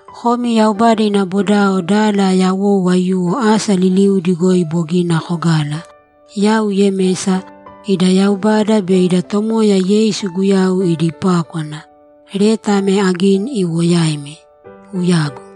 Komi Yaubada ina bodao dala yawou aiyuwo asa liliudi goi bogina kogala, Yau Yemesa, ida Yaubada be ida Tomoya Yeisu Guyau idi pákwana, leta ame agini iwo yaimi. Uyagu!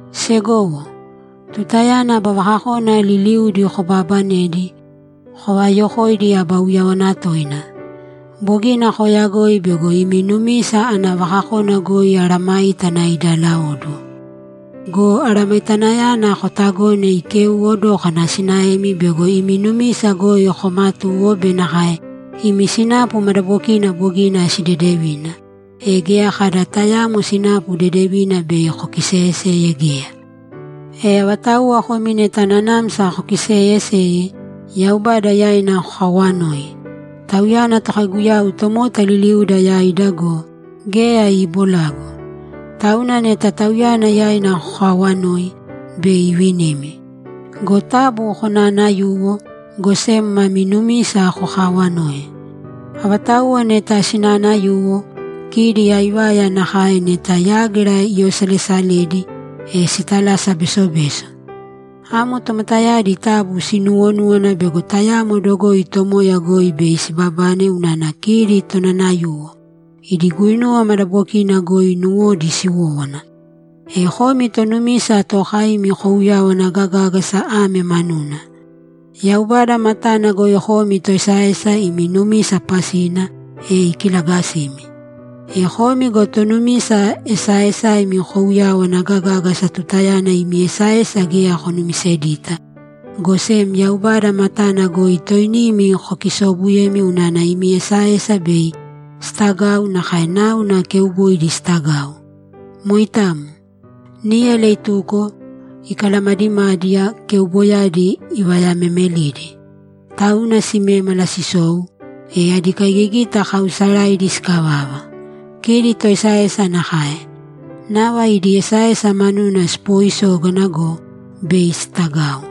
Segowo, tutayana aba vakakona liliuudi kobaabanedi, kovaayokōidi aba uyáwana toina. Bogina kooyagoi bego imi numisa ana vakakona goi mesayágana idaalaóduwo. Go aramaitanayana kootagōne ikeuwo dókana sinaemi bego imi numisa goi koomatuwo be nakae imi sinapu madabokina bogina sidedevina, e geya kada tayaamo sinapu dedevina bei kokiseyeseye geya. E avatauwa komi neta nanamsa kokiseeyeseye, Yaubada yaina kokaawanōi. Tauyana Tokaiguyau tomota liliuda yaida go, geya iibolagu. Tauna neta Tauyana yaina kokaawanoi, bei ivinimi. Go taabu konaanayūwo, go sem mami numisa kokaawanōi. Avatauwa neta sinaanayuwo, kidi aivaya nakae neta yágira iyaosalesaledi, e sitalasa besobeso. Amo tomotayadi taabu sinuuwonūwana bego tayamo dogoi Tomoya goi bei sibabane unana kidi tonanayuwo; idi guinuwa madabokina goi nuwodi siwówana. E komi tonumisa tookaimi kouyawana gagāgasa ame manuna: Yaubada matana goi komi toesaesa imi numisa pasina, e ikilagasimi. E komi go tonumisa esaaesaimi kouyawana gagāgasa tutayana imi esaesa geya konumisedita, go sem Yaubada matana goi toinimi kokisoobuyemi unana imi esaesa bei sitagau nakae náuna keuboidi sitagau. Moitamo. Níyala ituko, ikalamadimadiya, keuboidiyadi ivayamemelidi. Tauna simémala sisou, e adi kaigigita kaausaraidi sikavava. Kidi toesaesa nakae. Nava idi esaesa manuna sipooisógana go, bei sitagau.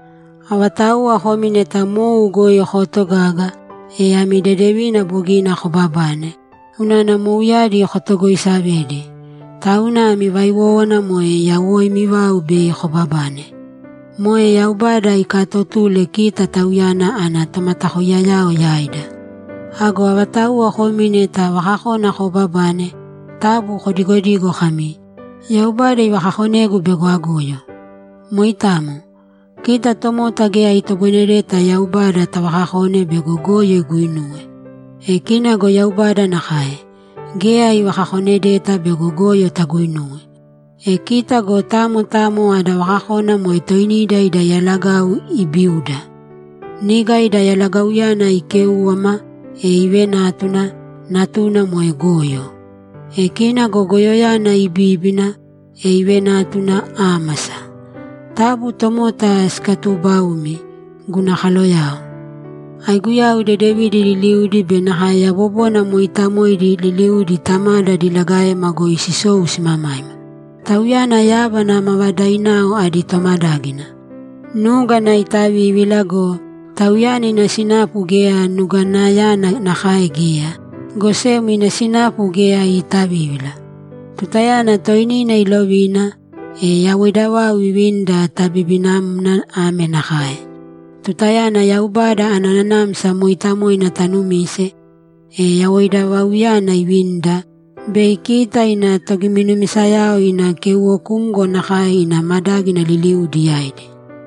Avatauwa komi neta mou goi kootogaga, e ami dedevina bogina kobabane, unana mouyadi kotogoisavedi. Tauna ami vaiwówana moe yawoimi vau bei kobabane. Moe Yaubada ikatotule kita Tauyana ana tomatakoiyao yaida. Ago avatauwa komi neta vakakona koobabane, taabu kodigodīgo kami, ‘Yaubada ivakakonegu bego agoyo.’ Moitamo. Kita tomota geya itoboinedeta Yaubada tavakakone bego goyo iguinuwe. E kina go Yaubada nakae, geya ivakakonedeta bego goyo taguinuwe. E kita go tamo tamo ada vakakona moe toinida ida yalagau iibiuda. Niga ida yalagauyana ikéuwama, e ivenátuna, natuna moe goyo. E kina go goyoyana ibíbina, e ivenátuna ámasa. Taabu tomota sikatuubaūmi, guna kaloyao. Aiguyau dedevidi liliudi be nakae yabobona mooitamoidi liliudi Tamada diligaema goi sisou simamaima. Tauyana yábana mavadainao adi tomadágina. Núgana iitavívila go, Tauyana ina sinapu geya nuganayana nakae geya, go sem ina sinapu geya iitavívila. Tutayana toinina ilovina, e yawoida vau ivinida tabibinamna ame nakae: Tutayana Yaubada ana Nanamsa Mooitamoina tanumise, e yawoida vauyana ivinida, bei kita ina togiminumisayao ina keuwokumgo nakae ina madágina liliudi yaidi.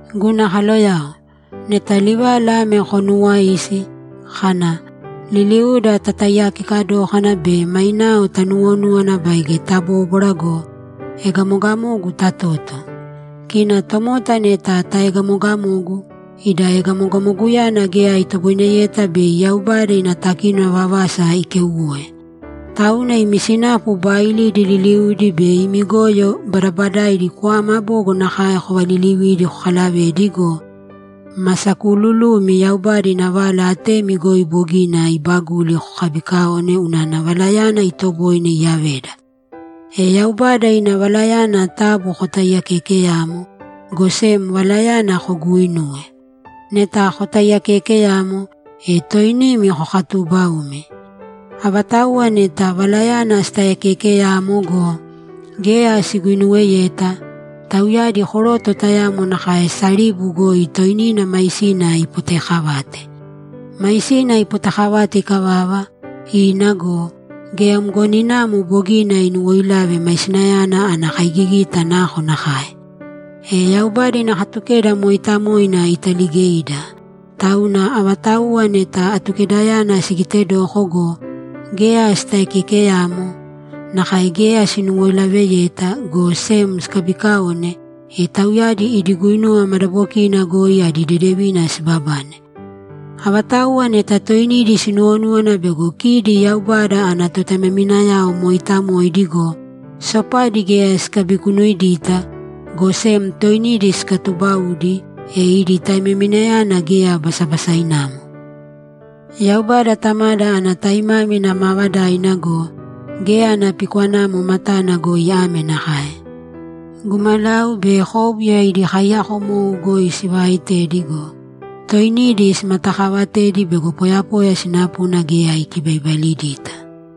Guna kaloyao, neta livala ame konuuwaisi, kana, ‘Liliuda tataiyakeka dōkana be mainao tanuwonūwana baige tabóbwara go, egamogamogu tatōto.’ Kita tomota neta taegamogamogu, ida egamogamoguyana geya itoboineyeta bei Yaubada ina takínona vavasa ikeuwoe. Tauna imi sinapu baailidi liliudi be imi goyo badabadaidi kwama bogo nakae kovalilivīdi kokalavēdi go, ma sakuululumi Yaubada ina vala atemi goi bogina iibaguli kokabiikaōne unana valayana itoboine iyaveda. E Yaubada ina valayana taabu kotaiyakeekeyāmo, go sem valayana koguuinūwe. Neta kotaiyakeekeyamo, e toinimi kokatuubaumi. Avatauwa neta valayana sitaiyakeekeyamo go, geya siguinuweyeta, tauyadi koroto tayamo nakae saribu goi toinina maisina ipotekavate. Maisina ipotekavate ikavava, ina go, geya mgoninamo bogina inuwoilave maisinayana ana kaigigita nakonakae! E Yaubada ina Katukeda mooitamoina italigeida, tauna avatauwa neta Atukedayana sigitedoko go, geya sitaiyakeekeyamo nakae geya sinuwoilaveyeta, go sem sikabiikaone, e tauyadi idi guinuwa madabokina goi adi dedevina sibabane. Avatauwa neta toinidi sinuwonúwana bego kidi Yaubada ana totaimaminao mooitamoidi go, sopadi geya sikabikunuidita, go sem toinidi sikatuubaudi, e idi taimaminayana geya basabasainamo. Yaubada Tamada ana taimámina maavadaina go, geya ana pikwanamo matana goi ame nakae: Gumalau be kóbuya idi kaiyakomou goi sivaaitedi go, toinidi simatakaavatedi bego poyapoya sinapuna geya ikibaibailidita.